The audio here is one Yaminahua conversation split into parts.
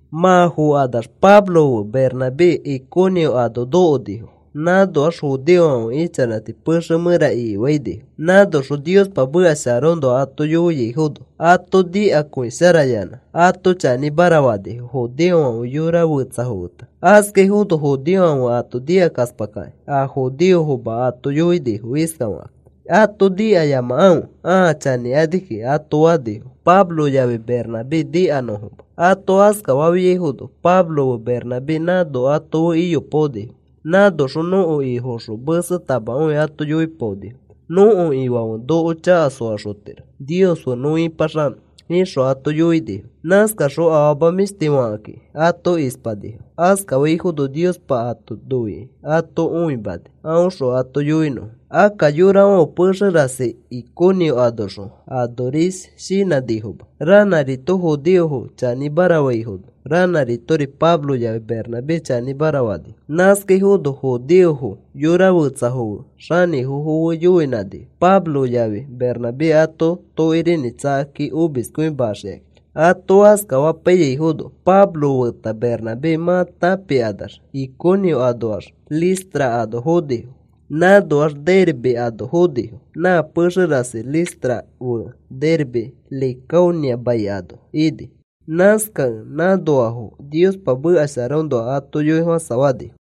Mã fokanax Pablo fe Bernabé Iconio ano nokonifo. Nãnoax judeofãfe ichanãti pexe mẽra ikifainifo. Nãnoxõ Niospa meka sharaõnoa ato yoiaifono ato nikakõisharayanã ato chanĩmara fanifo, judeofãfe yora fetsafo feta. Askaifono judeofãfe ato nikakaspakakĩ, a judeofoma ato yoinifo iskafakakĩ: “Ato nikayamakãfe ãa chanĩkani kiki,” ato fanifo Pablo yafi Bernabé nikanõfoma. Ato askafafiaifono Pablo fe Bernabé nãno ato fe iyopaonifo. Nãnoxõ nõko Ifoõxõ mesetamakõi ato yoipaonifo. “Nõko Ifãfe noko chaka soaxotiro Nios fe nõ ĩpaxanõ,” ixõ ato yoinifo. Nãskaxõ afama mĩshtifo fakakĩ ato ispanifo. Askafaifono Niospa ato noikĩ ato õimani aõxõ ato yoinõfo. Akka yorafãfe pexe rasi Iconio anoxõ anoris shinãnifoma. Ranãrito judeofo chanĩmara faifono, ranãritori Pablo yafi Bernabé chanĩmara fanifo. Nãskaifono judeofo yora fetsafo fe xanĩfofo fe yoinãnifo, Pablo yafi Bernabé ato tokirinĩ tsakakĩ omiskõimaxikakĩ. Ato askafapaiyaifono Pablo feta Bernabé mã tãpikanax Iconio anoax Listra ano fonifo, nãnoax Derbe ano fonifo. Nã pexe rasi Listra fe Derbe Licaonia mai ano ini. Nãskakẽ nãnoafo Niospa meka sharaõnoa ato yoifofãsafanifo.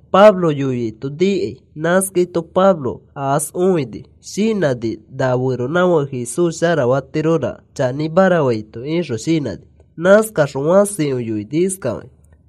Pablo yoiaito nikai. Nãskaito Pablo aas õikĩ shinãni na feronãfake Jesús sharafatiroraka chanĩmara faito ixõ shinãni. Nãskaxõ fãsikõi yoini iskafakĩ: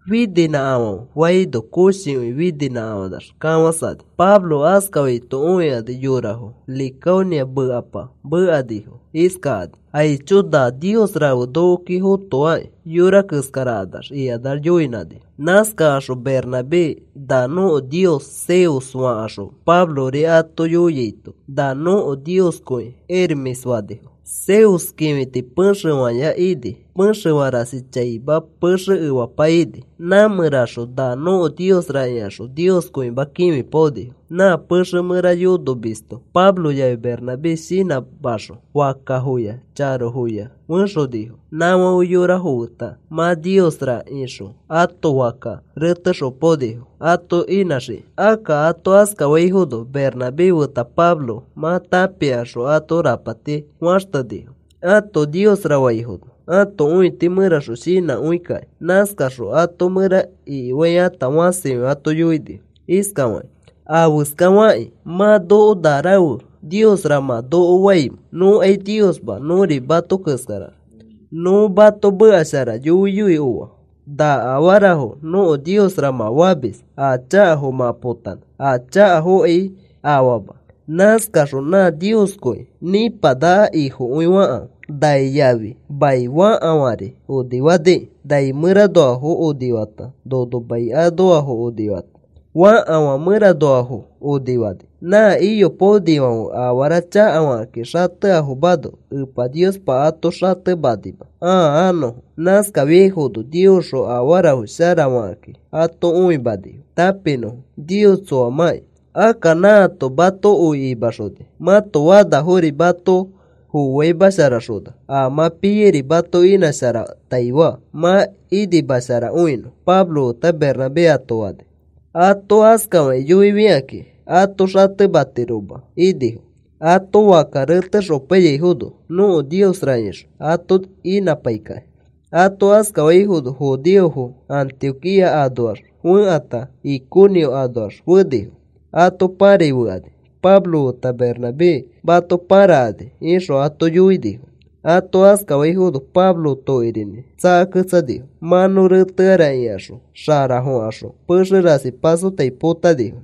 “Fininãkafãfe,” faino, koshikõi fininãkafãnax kafãsani. Pablo askafaito õikani, yorafo Licaonia mekapa mekanifo iskakani: “Aicho, na nios rafe nokoki fotoaki yora keskarakanax,” ikanax yoinãnifo. Nãskakaxõ Bernabé na nõko nios Zeus fakaxõ, Pablori ato yoiaito, “Na nõko nioskõi Hermes,” fanifo. Zeus kĩfiti pexeya ini pexe rasi chaima, pexe efapa ini. Nã mẽraxõ na nõko niosra ikaxõ Nioskõima kĩfipaonifo. Nã pexe mẽra yonomisto Pablo yafi Bernabé shinãmaxõ fakkafoya charofo fexonifo. Nãfãfe yorafo feta mã niosra ixõ ato fakka retexopainifo ato inãxikakĩ. Akka ato askafaifono Bernabé feta Pablo mã tãpikaxõ, ãto rapati faxtenifo, ato niosra faifono ãto õiti mẽraxõ shinãkõikaki. Nãskakaxõ ato mẽra ikifaikata fãsikõi ato yoinifo iskafakakĩ: “¿Afeskafakĩ mã noko na rafe niosra mã noko faimẽ? Nõkai niosma. Nõri mato keskara, nõ mato meka shara yoiyoi oa na afarafo nõko niosra mã famis a chakafo mã potanõ a chakafokai afama. Nãskaxõ nã Nioskõi nĩpanaka Ifokõi fakãfe, nai yafi mai fakafãri onifaniki. Nai mẽranoafo onifata, nono mai anoafo onifata fakafãri mẽranoafo onifani. Nã iyopaonifãfe afara chakafakĩ xateafomano Epa Niospa ato xatemanima ãa anõfo. Nãskafiaifono Niosxõ afarafo sharafakakĩ ato õimanifo, tãpinõfo Nios tsoamãki. Akka nãato mato oi imaxona, mãto fanafori mato fofaimasharaxona, a mã piairi mato inãsharataifa, mã inimasharakõinõ,” Pablo feta Bernabé ato fani. Ato askafakĩ yoifikakĩ ato xatematiroma inifo, ato fakka retexopaiyaifono nõko niosra ixõ ato inãpaikakĩ. Ato askafaifono judeofo Antioquía anoax fekãta Iconio anoax fenifo. Ato pãrai fekani, “Pablo feta Bernabé mato pãrakani,” ixõ ato yoinifo. Ato askafaifono Pablo tokirinĩ tsakaketsanifo. Mã nõ reteara ikaxõ xarafokaxõ pexe rasi pasotai potanifo.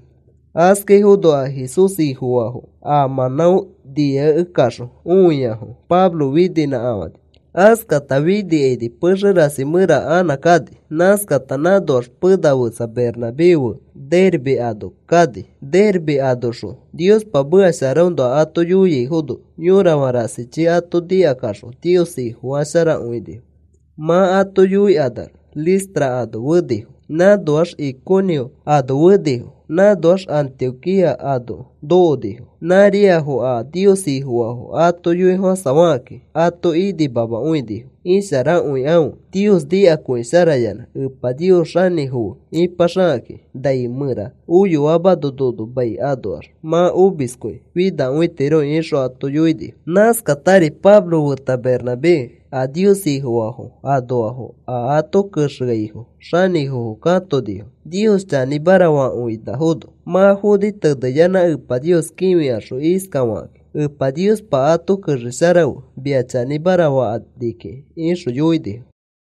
Askafaifono a Jesús Ifofaafo a mãnão niakekaxõ õiaifono Pablo fininãkafani. Askata finikaini pexe rasi mẽra anã kani. Nãskata nãnoax pena fetsa Bernabé fe Derbe ano kani. Derbe anoxõ Niospa meka sharaõnoa ato yoiaifono yõrafã rasichi ato nikakaxõ Nios Ifofasharakõinifo. Mã ato yoikanax Listra ano fenifo, nãnoax Iconio ano fenifo, nãnoax Antioquía ano nokonifo. Nãriafo a Nios Ifofaafo ato yoifofãsafakakĩ ato inimamakõinifo, “Isharakõikãfe Nios nikakõisharayanã. Epa Nios xanĩfo fe ipaxakakĩ, nai mẽra oyoamano nono mai anoax mã omiskõi finakõitiro,” ixõ ato yoinifo. Nãskatari Pablo feta Bernabé a Nios Ifofaafo anoafo a ato kexeaifo xanĩfofo katonifo, Nios chanĩmara fakõinafono. Mã foni teneyanã Epa Nios kĩfikaxõ iskafakakĩ: “Epa Niospa, ato kexesharafe mia chanĩmara fakani kiki,” ixõ yoinifo.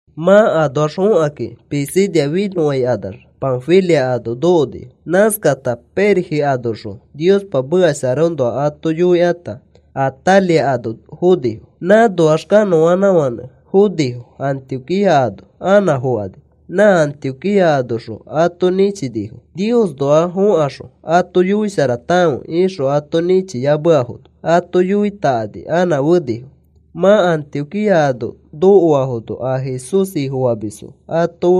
Mã anoax fokakĩ Pisidia finõfãikanax Panfilia ano nokonifo. Nãskakata Perge anoxõ Niospa meka sharaõnoa ato yoikata, Atalia ano fonifo. Nãnoax kanõanãfãnẽ fonifo Antioquía ano anã fokani. Nã Antioquía anoxõ ato nĩchinifo. “Niosnoax fokaxõ ato yoisharatakãfe,” ixõ ato nĩchiyameafono ato yoitakani anã fenifo. Mã Antioquía ano nokoafono a Jesús Ifofamisfo ato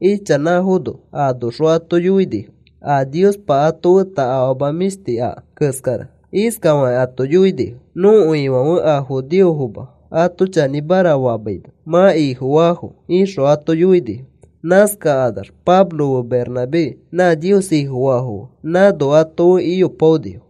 fe ichanãfono anoxõ ato yoinifo a Niospa ato feta afama mĩshti aka keskara. Iskafakĩ ato yoinifo: “Nõko Ifãfe a judeofoma ato chanĩmara famaino mã Ifofaafo,” ixõ ato yoinifo. Nãskakanax Pablo fe Bernabé nã Nios Ifofaafo fe nãno ato fe iyopaonifo.